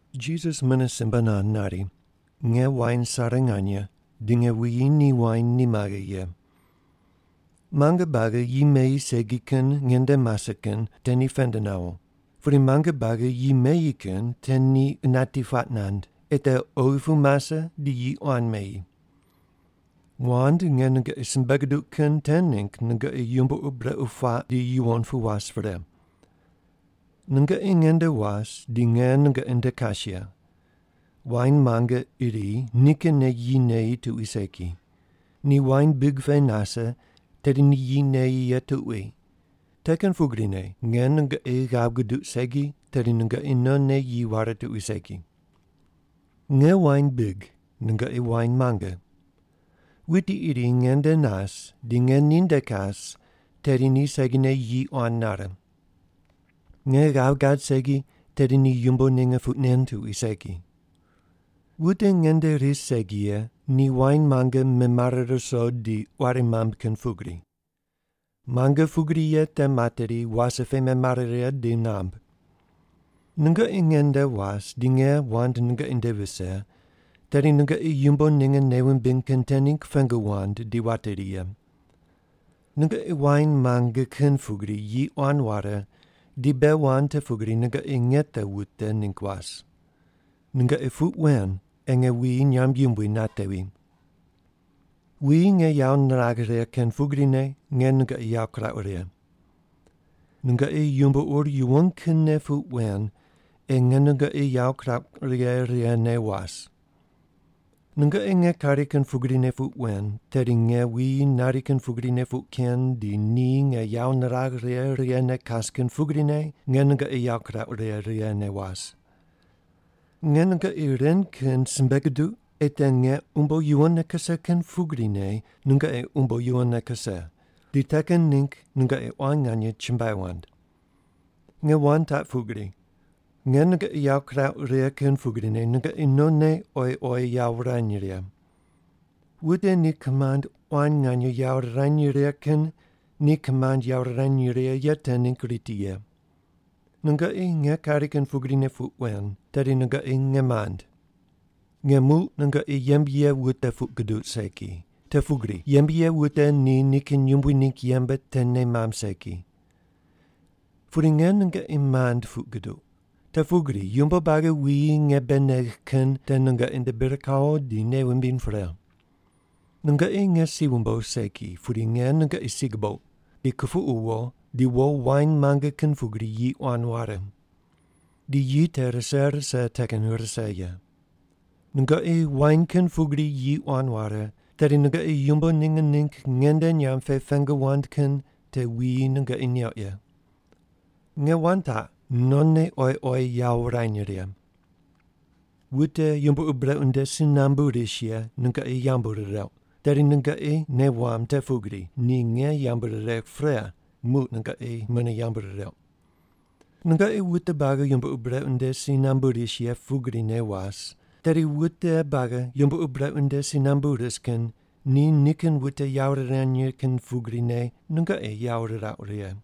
Jisas mune simbe nand nari, “Nge wain sare nganye, di nge wuyi ni wain ni maghe ye. Muange buagi yi meyi segi kin nge nde mase kin te ni pend nawo, pudi muange buagi yi meyi kin te ni qunati puaq nand, ei te oghi pu mase di yi quan meyi. Wand nge nungoqi simbe guduq kin te ningg nungoqi yumbo ur brequ puaq di yuwon pu was pre. Nungoqi nge nde was di nge nungoqi nde kas ye. Wain muange iri nikinne yi neyi tuqui segi. Ni wain big pe nase, tedi ni yi neyi ye tuqui. Te kin pugrine, nge nungoqi ghav guduq segi, tedi nungoqi nonne yi ware tuqui segi. “Nge wain big, nungoqi wain muange. Wuti iri nge nde nas di nge ninde kas, tedi ni segine yi quan nare. Nge ghav gad segi, tedi ni yumbo ninge puq nen tuqui segi. Wute nge nde ris segi ye ni wain muange memare ruso di quari mamb kin pugri. Muange pugri ye te materi, wase pe memare righe di namb. Nungoqi nge nde was di nge wand nungoqi nde vise, tedi nungoqi yumbo ninge nei wumbiny kin te ningg pengu wand di wateri ye. Nungoqi wain muange kin pugri yi quan ware di bei wand te pugri nungoqi nge te wute ningg was. Nungoqi puq wen ei nge wuyi nyamb yumbui natevi. “Wuyi nge yawo niragh righe kin pugrine nge nungoqi yawo kurauq righe. Nungoqi yumbo ur yuwon kinne puq wen ei nge nungoqi yawo kurauq righe righene was. Nungoqi nge kari kin pugrine puq wen, tedi nge wuyi nari kin pugrine puq ken di ni nge yawo niragh righe righene kas kin pugrine nge nungoqi yawo kurauq righe righene was. Nge nungoqi ren kin simbe guduq ei te nge umbo yuwonne kuse kin pugrine nungoqi umbo yuwonne kuse, di te kin ningg nungoqi quan nganye chumbuai wand. Nge wand taq pugri: Nge nungoqi yawo kirauq righe kin pugrine nungoqi nonne oyi oyi yawo wurany righe. Wute ni kimand quan nganye yawo rirany righe kin ni kimand yawo rirany righe ye te ningg riti ye. Nungoqi nge kari kin pugrine puq wen, tedi nungoqi nge mand. Nge muq nungoqi yembe ye wute puq guduq segi, te pugri yembe ye wute ni nikin yumbui ningg yembe te nei mamb segi. Pudi nge nungoqi mand puq guduq, te pugri yumbo buagi wuyi nge bei negh kin te nungoqi nde bir kawo di nei wumbiny pre. Nungoqi nge si wumbogh segi, pudi nge nungoqi si gubouq, di kupuqu wo, di wo wain muange kin pugri yi quan ware. Di yi te rise rise te kin rise ye. Nungoqi wain kin pugri yi quan ware, tedi nungoqi yumbo ninge ningg nge nde nyamb pe pengu wand kin te wuyi nungoqi neuq ye. Nge wand taq: Nonne oyi oyi yawo wurany righe. “Wute yumbo ur brequ nde si nambu ris ye nungoqi yambu rireuq, tedi nungoqi nei wamb te pugri ni nge yambu riregh pre, muq nungoqi mune yambu rireuq. Nungoqi wute buagi yumbo ur brequ nde si nambu ris ye pugrine was, tedi wute buagi yumbo ur brequ nde si nambu ris kin ni nikin wute yawo rirany righe kin pugrine nungoqi yawo rirauq righe.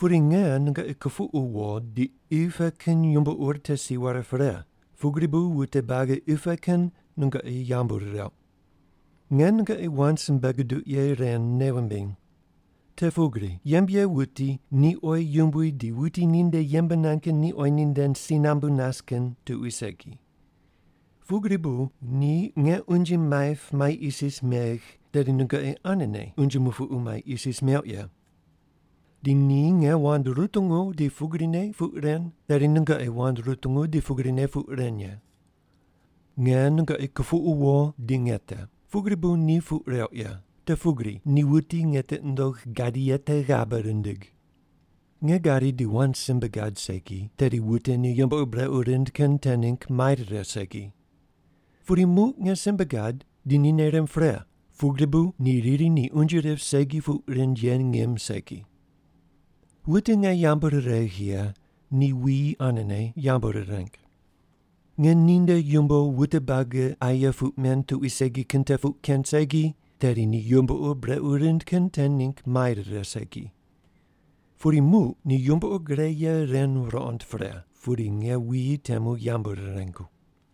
Pudi nge nungoqi kupuqu wo di qi pe kin yumbo ur te si ware pre, pugri bu wute buagi qi pe kin nungoqi yambu rireuq. Nge nungoqi wand simbe guduq ye ren nei wumbiny. Te pugri yembe ye wuti ni oyi yumbui di wuti ninde yembe nand kin ni oyi ninde si nambu nas kin tuqui segi. Pugri bu ni nge unje maip mai isis megh, tedi nungoqi anene unje mupuqu mai isis meuq ye. Di ni nge wand rutungu di pugrine puq ren, tedi nungoqi wand rutungu di pugrine puq ren ye. Nge nungoqi kupuqu wo di nge te, pugri bu ni puq reuq ye, te pugri ni wuti nge tiqi nundogh gadi ye te ghabe rindig. Nge gadi di wand simbe gad segi, tedi wute ni yumbo ur brequ rind kin te ningg mai rire segi. Pudi muq nge simbe gad di ni nei rimb pre, pugri bu ni riri ni unje rip segi puq rind ye ngim segi. Wute nge yambu riregh ye ni wuyi anene yambu rireng. Nge ninde yumbo wute buagi aye puq men tuqui segi kin te puq ken segi, tedi ni yumbo ur brequ rind kin te ningg mai rire segi. Pudi muq ni yumbo ur gre ye ren ruqond pre, pudi nge wuyi temu yambu rirengu.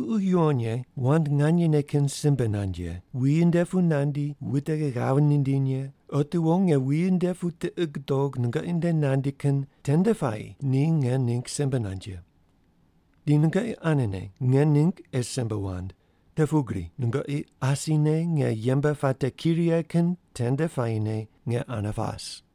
“Ququ Yuwon Ye, wand nganyene kin simbe nand ye, wuyi nde pu nandi wute ghav nindiny ye, otiwo nge wuyi nde pu tiqi gudog nungoqi nde nandi kin tende puayi ni nge ningg simbe nand ye. Di nungoqi anene nge ningg ei simbe wand, te pugri nungoqi asine nge yembe puate ki righe kin tende puayine nge ane pas.